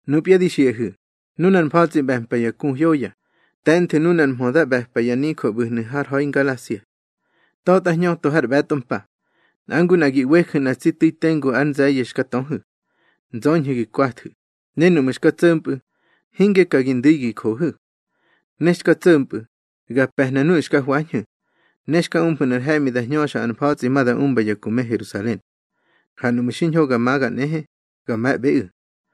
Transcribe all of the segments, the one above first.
Nupya di xiꞌahu̱, nunar mfa̱tsꞌi ꞌbe̱mpa ya ku hyoya, te̱nthu̱ nunar mhö da ꞌbe̱pa ya nijö ꞌbu̱hnu̱ har ha̱i Ngalasia. Ta̱tꞌa hñöto har ꞌbe̱tꞌo mpa, nꞌa ngu nꞌa gi ꞌweju̱ nꞌa tsi tu̱i tengu ár nze̱ye̱ xka töhu̱. Nzöñhu̱ gi kwathu̱, ne núꞌmu̱ xka tso̱mpꞌu̱, hinge ka gi ndu̱i gi johu̱. Ne xka tso̱mpꞌu̱, ga pe̱hna nuꞌu̱ xka hwañhu̱, ne xka umfu̱ nꞌar he̱ꞌmi da hñöxa ar mfa̱tsꞌi ma da umba ya ku me Herusalen. Ha nuꞌmu̱ xiñho ga maga nꞌehe, ga me̱ꞌbeꞌu̱.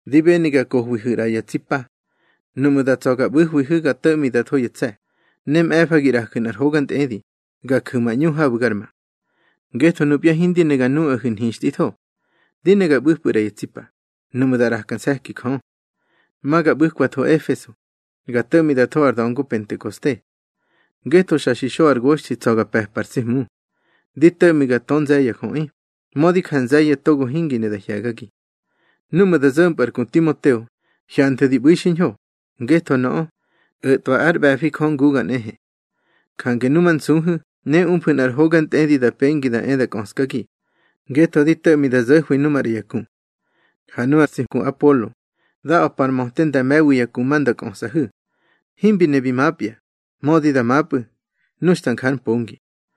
Di beni ga kohwihu̱ ꞌra ya tsi pa. Nuꞌmu̱ da tsa̱ ga ꞌbu̱hwihu̱ ga to̱ꞌmi da tho ya tse̱, ne mꞌe̱fa gi ꞌraju̱ nꞌar hoga ntꞌedi, ga ju̱ ma ꞌñu habu̱ gar ma. Ngetho nupya hindi ne ga nuꞌahu̱ nhixtꞌitho. Di ne ga ꞌbu̱pꞌu̱ ꞌra ya tsi pa, nuꞌmu̱ da ꞌraka nse̱ki Jö. Ma ga ꞌbu̱kwatho Efeso, ga to̱ꞌmi da tho ar da̱ngo Pentekoste. Ngetho xa xi xo ar goxthi tsa̱ ga pe̱pa ar tsi Hmu. Di to̱ꞌmi ga tö nze̱ ya jöꞌi, mödi ja nze̱ye̱ togo hingi ne da hye̱gagi. Núꞌmu̱ da zo̱mpꞌu̱ ar ku Timoteo, hyanthu̱ di ꞌbu̱i xiñho, ngetho nöꞌö, o̱tꞌwa ár ꞌbe̱fi Jö nguga nꞌehe. Jange numansuhu̱ ne umfu̱ nꞌar hoga ntꞌedi da pengi da e da kꞌöskagi, ngetho di to̱ꞌmi da zo̱hwi nu maꞌra ya ku. Ha nu ar tsi ku Apolo, da a̱pa ar möte nda me̱wi ya ku ma nda kꞌösꞌahu̱. Himbi ne bi mapya, mödi da mapꞌu̱, nu xta nja ár mpongi.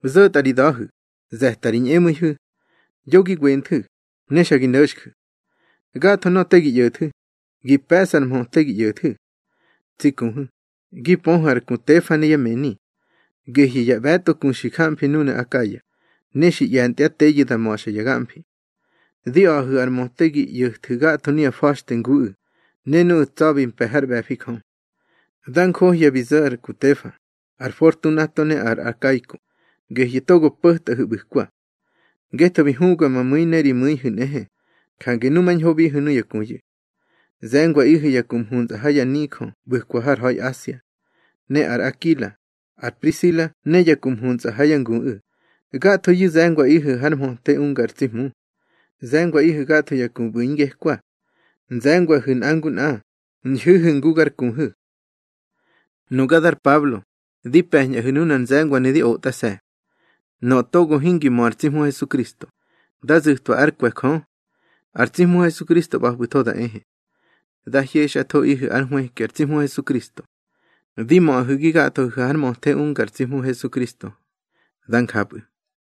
Zo̱tꞌa ri da̱hu̱, ze̱ta ri ñꞌemu̱ihu̱. Yo gi wenthu̱, ne xa gi no̱xju̱. Gatho nöꞌö te gi ꞌyo̱thu̱, gi pe̱ꞌsu̱ ar mhöte gi ꞌyo̱thu̱. Tsi kuhu̱, gi pöhu̱ ar ku Tefa ne yá mëni. Gehyu̱ ya ꞌbe̱tꞌo ku xi jamfi núnu̱ Akaya, ne xi ꞌye̱ntyá teyu̱ da ma̱xa ya gamfi. Di a̱ꞌahu̱ ar möte gi ꞌyo̱thu̱ gatho nuya fa̱xte nguꞌu̱, ne nuꞌu̱ tsa̱bi mpe̱ hár ꞌbe̱fi Jö. Da njohya bi zo̱ ar ku Tefa, ar Fortunato ne ar Akaiko, gehyu̱ togo po̱tꞌahu̱ ꞌbu̱kwa. Ngetho bi hubga ma mu̱i ne ri mu̱ihu̱ nꞌehe, jange numañhobihu̱ nuya kuyu̱. Ze̱ngwaꞌihu̱ ya ku mhuntsꞌa ha ya nijö ꞌbu̱kwa har ha̱i Asia. Ne ar Akila, ar Prisila ne ya ku mhuntsꞌa ha yá nguꞌu̱, gathoyu̱ ze̱ngwaꞌihu̱ har mhöte unga ar tsi Hmu. Ze̱ngwaꞌihu̱ gatho ya ku ꞌbu̱ ingekwa. Nze̱ngwahu̱ nꞌa ngu nꞌa, ñhu̱hu̱ ngu gar kuhu̱. Nuga dar Pablo, di pe̱ñꞌahu̱ nunar nze̱ngwanu̱ di otꞌase̱. Nöꞌö togo hingi mö ar tsi Hmu Hesukristo, dá zu̱twa ár kwe̱ Jö. Ar tsi Hmu Hesukristo ꞌba̱pꞌu̱tho da ehe. Dá hyexꞌathoꞌihu̱ ár nhwëki ar tsi Hmu Hesukristo. Di möꞌahu̱ gi gathohu̱ har mhöte unga ar tsi Hmu Hesukristo. Dá njapꞌu̱.